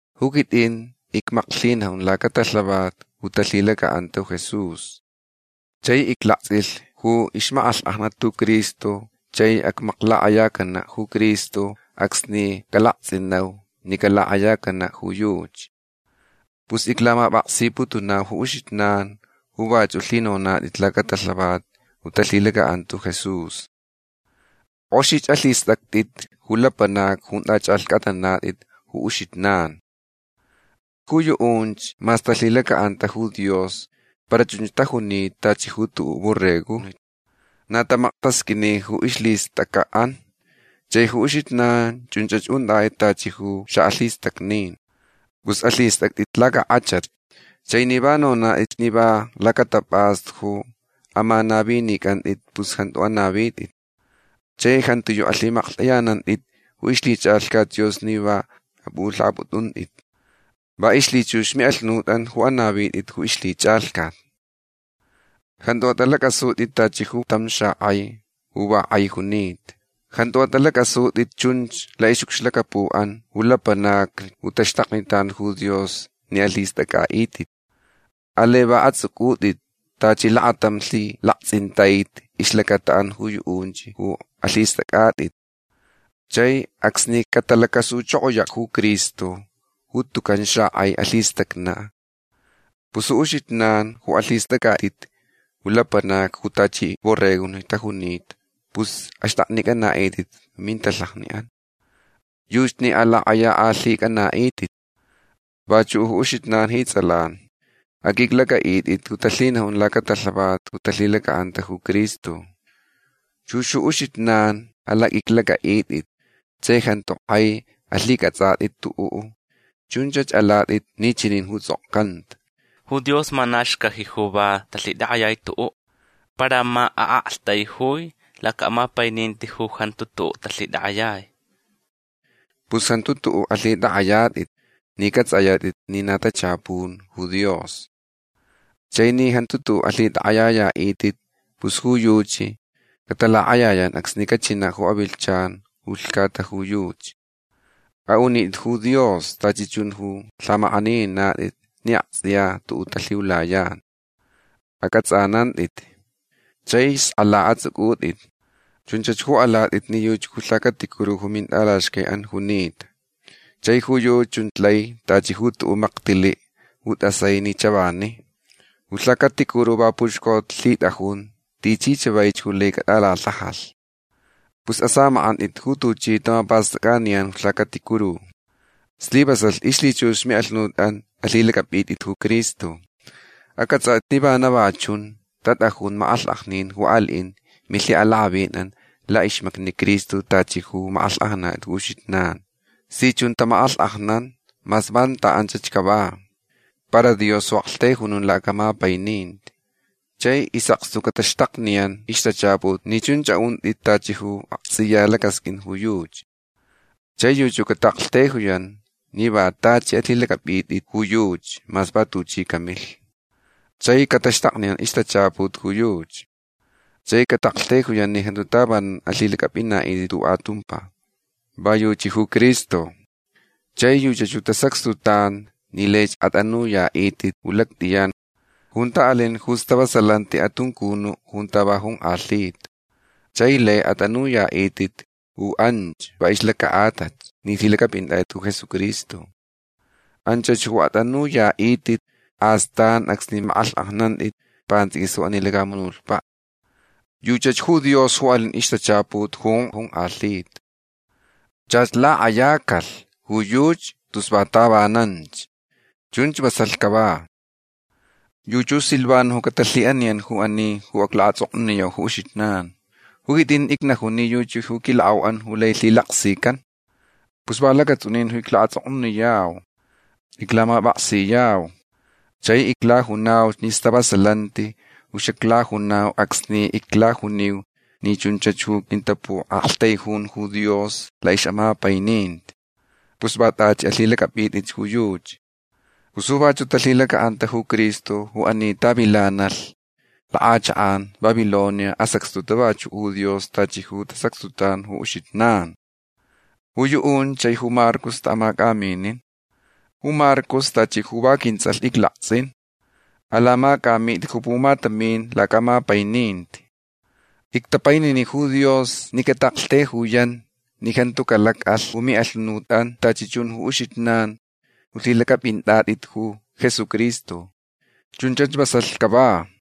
Ju quitʼin icmaklhinajun lacatalhavat ju talhilacaʼanta ju Jesús. Chai iclaktsʼilh ju ixmakʼalhkʼajnat ju Cristo chai acmaklakʼayacanaʼ ju Cristo acsni calaktsʼinau ni calakʼayacanaʼ ju yuchi. Pus iclamapʼaksiputunau ju uxijnan ju vachuʼ lhinonatʼit lacatalhavat ju talhilacaʼanta ju Jesús. Kʼoxich alhistʼactʼitch ju lapanacni junta chʼalhcʼatnanatʼit ju uxijnan. Ju yuʼunch mas talhilacaʼanta ju Dios para chunch tajunita tachi ju tuʼuʼ borregojni. Na tamaktasqʼuini ju ixʼalhistʼacʼaʼan. Chai ju uxijnan chunch untʼatʼit tachi ju xaʼalhistacnin. Pus alhistʼactʼit lacakʼachatch. Chai ni va nonatʼitch ni va lacatapʼastu ju amanavinicʼantʼit pus jantu anavitʼit. Chai jantiyuʼ alhiʼamaklhtʼayanantʼit ju ixlhichʼalhcat Dios ni va apʼulhaʼapʼutʼuntʼit. Va ixlhichux miʼalhunutʼan ju anavitʼit ju ixlhichʼalhcat. Jantu atʼalacʼasutʼit tachi ju tam xakʼai ju va kʼai junita. Jantu atʼalacʼasutʼit chun laʼixʼucxlacapuʼan ju lapanacni ju taxtaknitan ju Dios ni alhistʼacʼaʼitʼit. Alai va atsʼucʼutʼit tachi lakatam lhilaktsʼintaiti ixlacataʼan ju yuʼunch ju alhistʼacʼatʼit. Chai acsni catalacasuchokoyach ju Cristo ju tucan xakʼai alhistacnaʼ pus ju uxijnan ju alhistʼacʼatʼit ju lapanacni ju tachi borregojni tajunita pus axtʼaknicʼanaʼitʼit ju mintalhajaʼan. Yuchi ni alakʼayakʼalhicʼanaʼitʼit. Vachuʼ ju uxijnan ji tsʼalan. Aqʼuiclacʼaʼitʼit ju talhinajun lacatalhavat ju talhilacaʼanta ju Cristo. Chux ju uxijnan alaqʼuiclacʼaʼitʼit chai jantu kʼai alhicʼatsʼatʼit tuʼuʼ. Chunch alatʼit ni chani ju tsʼokcanta: Ju Dios ma na xcaji ju va talhitakʼayai tuʼuʼ. Para ma aʼaktaijui lacaʼamapaininti ju jantu tuʼuʼ talhitakʼayai. Pus jantu tuʼuʼ alhitʼakʼayatʼit ni cʼatsʼayatʼit ni na tachapun ju Dios. Chai ni jantu tuʼuʼ alhitʼakʼayayaʼitʼit pus ju yuchi catalakʼayayan acsni cachinaʼ ju avilhchan ju lhcata ju yuchi. Aʼunitʼit ju Dios tachi chun ju lhamakʼanininatʼit ni aktsʼiya tuʼuʼ talhiulayan. Acʼatsʼanantʼit. Chai skʼala atsʼucʼutʼit. Chunch ju alatʼit ni yuchi ju lhacaticuru ju mintʼalaxcaiʼan junita. Chai ju yuchi chun lai tachi ju tuʼuʼ maktiliʼ ju tʼasai ni chavani. Ju lhacaticuru va puxcolhitʼajun tichi chavaich ju lai catʼalalhajalh. Pus asamakʼantʼit ju tuchi tamapastʼacʼaniyan ju lhacaticuru. Slivasalh ixlhichux ju miʼalhunutʼan alhilacʼapʼitʼit ju Cristo. Acʼatsʼatʼitch ni vana va chun tatʼajun makʼalhkʼajnin ju aliʼin milhiʼalakʼavinʼan laʼixmacni Cristo tachi ju makʼalhkʼajnanatʼit ju uxijnan. Si chun tamakʼalhkʼajnan mas vanta anchach cava. Para Dios ju aʼaktaijunun lacaʼamapaininti. Chai isʼakstu ju cataxtakniyan ixtachaput ni chunch aʼuntʼit tachi ju aktsʼiya lacasqʼuin ju yuchi. Chai yuchi ju cataʼaktaijuyan ni va tachi alhilacʼapʼitʼit ju yuchi mas va tuchi camilh. Chai cataxtakniyan ixtachaput ju yuchi. Chai cataʼaktaijuyan ni jantu tavanan alhilacʼapʼinaʼitʼit tuʼuʼ atumpa. Va yuchi ju Cristo. Chai yuchach ju tasacxtutan ni laich atʼanuyaʼitʼit ju lactʼiyan junta alin ju stavasalanti atuncunuʼ junta va jonkʼalhita. Chai lai atʼanuyaʼitʼit ju anch va ixlacaʼatalh ni lhilacʼapʼinatʼit ju Jesucristo. Anchach ju atʼanuyaʼitʼit astan acsni makʼalhkʼajnantʼit pantsʼiquis ju ani lacamunutpaʼ. Yuchach ju Dios ju alin ixtachaput ju jonkʼalhita. Chach lakʼayacalh ju yuchi tus va tavananch. Chunch vasalh cava. Yuchi ju Silvano ju catalhiʼaniyan ju ani ju iclaʼatsʼoknuniyau ju uxijnan. Ju quitʼin icnajun ni yuchi ju quilakʼauʼan ju lai lhilaksican. Pus va lacatsʼunin ju iclaʼatsʼoknuniyau. Iclamapʼaksiyau. Chai iclajunauch ni stavasalanti ju xaclajunau acsni iclajuniu ni chunch ju quintapuʼaktaijun ju Dios laʼixʼamapaininti. Pus va tachi alhilacʼapʼitʼit ju yuchi. Pus ju vachuʼ talhilacaʼanta ju Cristo ju ani tavilanalh lakʼachakʼan Babilonia asacxtuta vachuʼ ju Dios tachi ju tasacxtutan ju uxijnan. Ju yuʼunch chai ju Marcos taʼamacʼaminin. Ju Marcos tachi ju va quintsʼalh iclaktsʼin. Alamacʼamitʼit ju pumatamin lacaʼamapaininti. Ictapainini ju Dios ni cataʼaktaijuyan ni jantu calacʼalh ju miʼalhunutʼan tachi chun ju uxijnan ju lhilacʼapʼinatʼit ju Jesucristo. Chunchach vasalh cava.